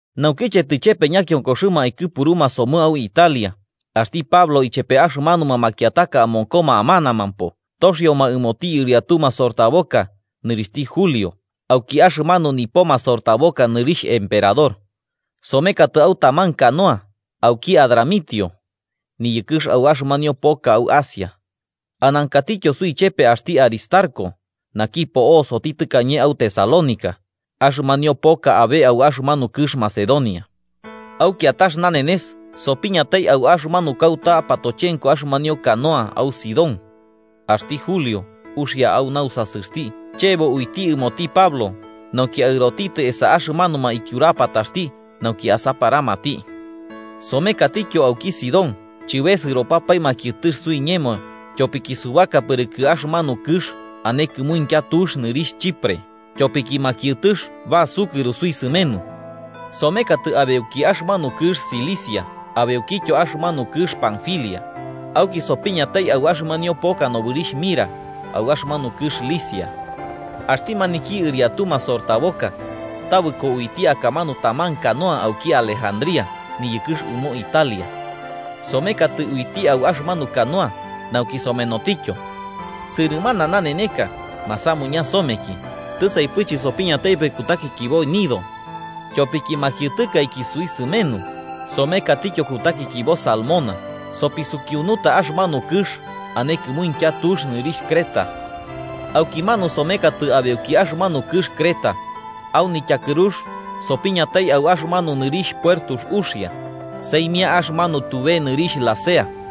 Naukiche tɨchepe ñakionkoxɨma aikɨpuruma somɨ au Italia, axti Pablo ichepe axɨmanuma makiataka amonkoma amanamampo toxioma ɨmoti ɨriatu masortaboka nɨrixhti Julio, auki axɨmanu nipo masortaboka nɨrixh Emperador. Somekatɨ au taman canoa auki Adramitio, niyɨkɨx au axɨmanio poka au Asia. Anankatityo suichepe axti Aristarco, naki po'osoti tɨkañe au Tesalónica axɨmanio poka abe au axɨmanu kɨx Macedonia. Au kiatax nanenes sopiñatai au axɨmanu kauta patochenko axɨmanio canoa au Sidón, axti Julio uxia au nausasɨxti chebo uiti ɨmoti Pablo nauki aɨrotitɨ esa axɨmanuma ityurapataxti nauki asaparamati. Somekatityo auki Sidón, chɨbesɨropɨpae makiɨtɨx suiñemo tyopiki subaka pɨrɨkɨ axɨmanu kɨx ane kɨmuintya tux nɨrixh Chipre, tyopiki makiɨtɨx basukɨro suisɨmenu. Somekatɨ abeuki axɨmanu kɨx Cilicia abeukityo axɨmanu kɨx Panfilia, auki sopiñatai au axɨmanio poka nobɨrixh Mira au axɨmanu kɨx Licia. Axti maniki ɨriatu masortaboka tabɨko uiti akamanu taman canoa auki Alejandría niyɨkɨx ɨmo Italia, somekatɨ uiti au axɨmanu canoa nauki somenotityo. Sɨrɨmana naneneka masamuña someki tisaipɨ chɨsopiñataipɨ kutakikibo Gnido. Tyopiki makiɨtɨkaiki suisɨmenu, somekatityo kutakikibo Salmona sopisukiunuta axɨmanu kɨx ane kɨmuintya tux nɨrixh Creta. Aukimanu somekatɨ abeuki axɨmanu kɨx Creta, au nityakɨrux sopiñatai au axɨmanu nɨrixh Puertux Uxia, saimia axɨmanu tube nɨrixh Lasea.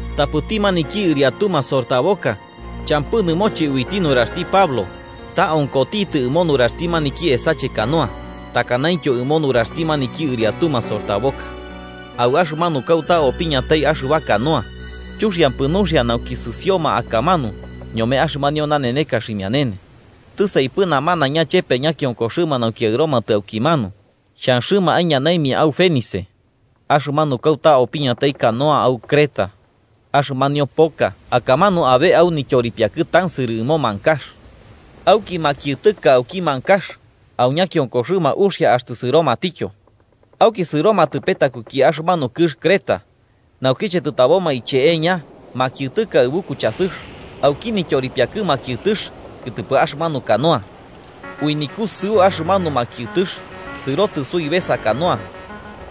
Tapɨti maniki ɨriatu masortaboka champɨ nɨmoche uiti nuraxti Pablo, ta onkotitɨ ɨmo nuraxti maniki esache canoa, takanaintyo ɨmo nuraxti maniki ɨriatu masortaboka. Au axɨmanu kauta opiñatai axɨba canoa chuxiampɨ nuxia nauki sɨsioma akamanu ñome axɨmanio naneneka ximianene, tɨsaipɨ namanaiña chepe ñakionkoxɨma nauki aɨromatɨ aukimanu xhanxɨma aiñanaimia au Fenice, axɨmanu kauta opiñatai canoa au Creta, axɨmanio poka akamanu abe au nityoripiakɨ tansɨrɨ ɨmo mankax. Auki makiɨtɨka auki mankax au ñakionkoxɨma uxia axtɨ sɨromatityo. Auki sɨromatɨ petakuki axɨmanu kɨx Creta. Naukiche tɨtaboma icheeña makiɨtɨka aɨbu kuchasɨx auki nityoripiakɨ makiɨtɨx kɨtɨpɨ axɨmanu canoa. Ui nikusɨu axɨmanu makiɨtɨx sɨrotɨ suibesa canoa,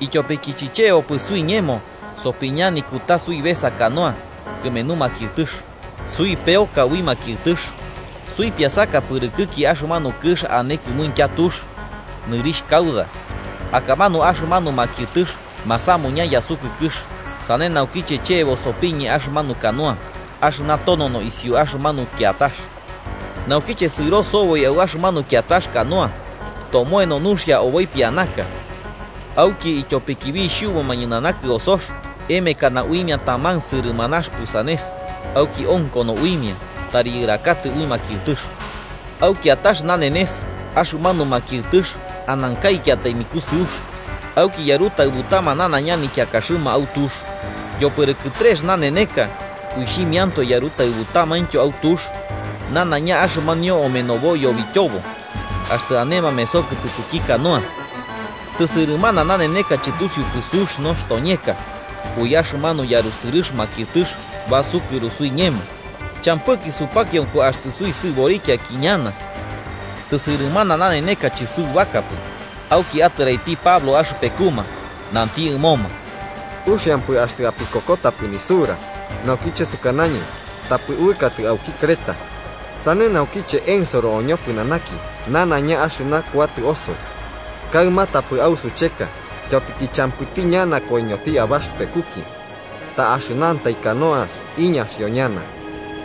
ityopiki chichebopɨ suiñemo sopiña nikuta suibesa canoa kɨmenu makiɨtɨx, peoro somɨ ui makiɨtɨx. Suipiasaka pɨrɨkɨki axɨmanu kɨx ane kɨmuintya tux, nɨrixh Cauda, akamanu axɨmanu makiɨtɨx masamuña yasukɨkɨx, sane naukiche chebo sopiñe axɨmanu canoa axɨna tonono isiu axɨmanu kiatax. Naukiche sɨro soboi au axɨmanu kiatax canoa, tomoeno nuxia oboi pianaka. Auki ityopiki bixhubuma ñɨnana kɨosox, emekana uimia taman sɨrɨmanax pusanes, auki onkono uimia tari yɨrakatɨ ui makiɨtɨx. Au kiatax nanenes axɨmanu makiɨtɨx anankaikiatai nikusɨux, auki yarutaɨbutama nanaiña nikiakaxɨma au tux. Yopɨrɨkɨ trex naneka, uixhimiantoe yarutaɨbutamaintyo au tux nanaiña axɨmanio omenobo yobityobo axtɨ ane mameso kɨtɨpɨki canoa. Tɨsɨrɨmana naneneka chɨtusiupɨ sux nostoñeka, ui axɨmanu yarusɨrɨx makiɨtɨx basukɨro suiñemo, champɨki supakionko axtɨ suisɨborikiaiki ñana. Tɨsɨrɨmana naneneka chɨsubakapɨ, auki atɨraiti Pablo axɨpekuma, nanti ɨmoma: –Uxiampɨ axtɨ apikokotapɨ nisura naukiche sukanañɨ tapɨ uɨkatɨ auki Creta. Sane naukiche ensoro oñopɨnanaki nanaiña axɨna kuatɨ osoi. Kaɨma, tapɨ ausucheka, ityopiki champɨti ñana koiñoti abaxɨpekuki. Ta axɨnantai canoax iñaxio ñana.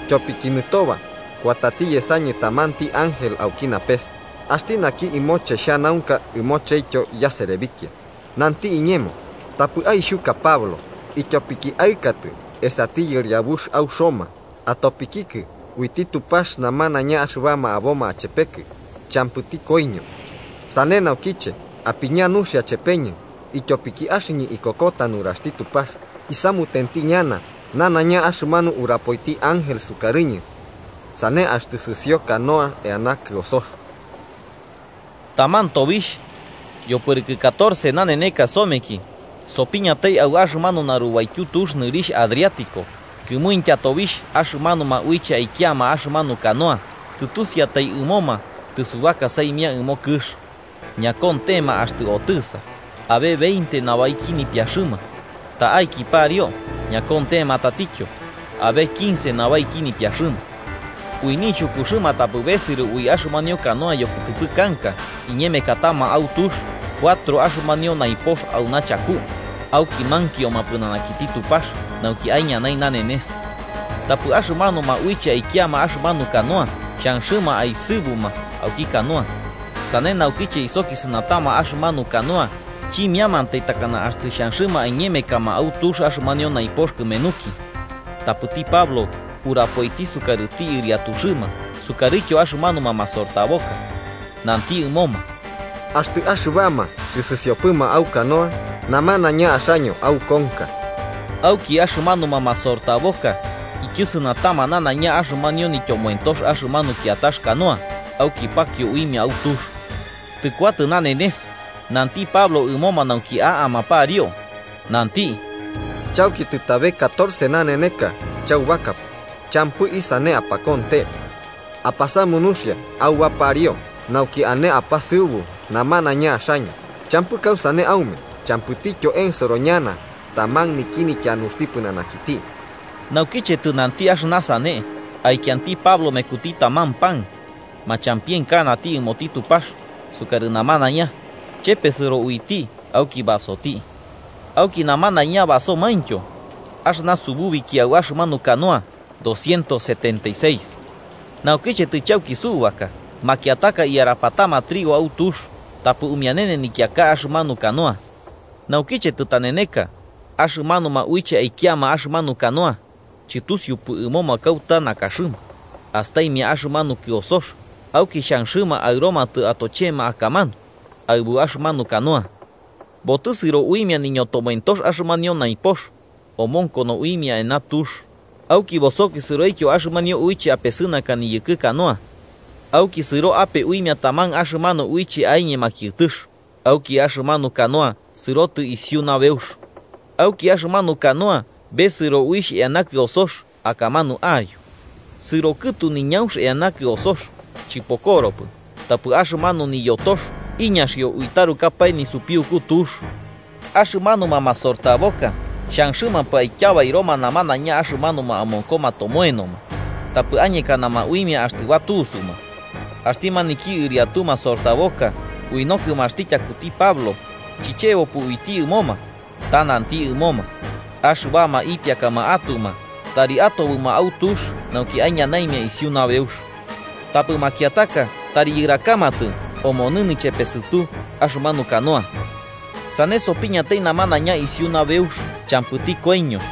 Tyopiki nɨtoba axɨñɨ kuatati yesañɨ tamanti ángel auki napes, axti naki ɨmoche xhanaunka ɨmochetyo yaserebikia, nanti iñemo: ‘Tapɨ aixhuka Pablo, ityopiki aɨkatɨ esati yɨriabux au Roma, atopikikɨ uiti Tupax namanaiña axɨbama aboma achepekɨ champɨti koiño.’ Sane naukiche, apiña nuxia chepeñɨ, ityopiki axɨñɨ ikokota nuraxti Tupax, isamutenti ñana nanaiña axɨmanu urapoiti ángel sukarɨñɨ. Sane axtɨ sɨsio canoax eana kɨosox. Taman tobixh, yopɨrɨkɨ catorce naneneka someki, sopiñatai au axɨmanu narubaityu tux nɨrixh Adriático, kɨmuintya tobixh axɨmanuma uiche aikiama axɨmanu canoa tɨtusiatai ɨmoma tɨsubaka saimia ɨmo kɨx. Ñakontema axtɨ otɨsa, abe veinte nabaiki nipiaxɨma, ta'aki pariu ñakontema tatityo, abe quince nabaiki nipiaxɨma. Ui nixhukuxɨma tapɨ besɨro ui axɨmanu canoa yokɨtɨpɨ kanka, iñemekatama au tux cuatro axɨmanio naipox auna chaku, auki mankioma pɨnanakiti Tupax nauki aiñanai nanenes. Tapɨ axɨmanuma uiche aikiama axɨmanu canoa xhanxɨma aesɨbuma auki canoa, sane naukiche isokisɨnatama axɨmanu canoa chimiamantai takana axtɨ xhanxɨma aiñemekama au tux axɨmanio naipox kɨmenuki. Tapɨti Pablo urapoiti sukarɨti ɨriatuxɨma sukarɨtyo axɨmanuma masortaboka, nanti ɨmoma: –Axtɨ axɨbama chɨsɨsiopɨma au canoa, namanaiña axaño aukonka. Auki axɨmanuma masortaboka ityɨsɨnatama nanaiña axɨmanio nityomoentox axɨmanu kiatax canoa auki pakio uimia au tux. Tɨkuatɨ nanenes, nanti Pablo ɨmoma nauki a'ama pariu, nanti: –Chauki tɨtabe catorce naneneka chaubakapɨ, champɨ isane apakonte. Apasamu nuxia auba pariu nauki ane apasɨubu, namanaiña axaño champɨ kausane aume, champɨityo ensoro ñana taman niki nityanuxti pɨnanakiti. Naukiche tɨnanti axɨna sane, aikianti Pablo mekuti taman pan, machampienkanati ɨmoti Tupax sukarɨ namanaiña, chepesɨro uiti auki basoti. Auki namanaiña basomaintyo. Axɨna sububiki au axɨmanu canoa doscientos setenta y seis. Naukiche tɨchauki subaka, makiataka iyarapatama trigo au tux tapɨ umianene nikiaka axɨmanu canoa. Naukiche tɨtaneneka, axɨmanuma uiche aikiama axɨmanu canoa, chɨtusiupɨ ɨmoma kauta nakaxɨma, astaimia axɨmanu kɨosox, auki xhanxɨma aɨromatɨ atochema akamanu aɨbu axɨmanu canoa. Botɨsɨro uimia niñotomoentox axɨmanio naipox, omonkono uimia eana tux, auki bosokisɨroityo axɨmanio uiche apesɨnaka niyɨkɨ canoa. Auki sɨro ape uimia taman axɨmanu uiche aiñe makiɨtɨx, auki axɨmanu canoa sɨrotɨ isiu nabeux. Auki axɨmanu canoa besɨro uixh eana kɨosox akamanu a'ayo. Sɨrokɨtu niñaunx eana kɨosox, chɨpokoropɨ, tapɨ axɨmanu niyotox iñaxio ui tarukapae nisupiuku tux. Axɨmanuma masortaboka xhanxɨmampɨ aityabairoma namanaiña axɨmanuma amonkoma tomoenoma, tapɨ añekanama uimia axtɨ batusuma. Axti maniki ɨriatu masortaboka ui nokɨmaxti tyakuti Pablo, chichebopɨ uiti ɨmoma, ta nanti ɨmoma, axɨbama ipiakama atuma tari atobɨma au tux nauki aiñanaimia isiu nabeux. Tapɨ makiataka tari yɨrakamatɨ omonɨ nichepesɨtu axɨmanu canoa. Sane sopiñatai namanaiña isiu nabeux champɨti koiño.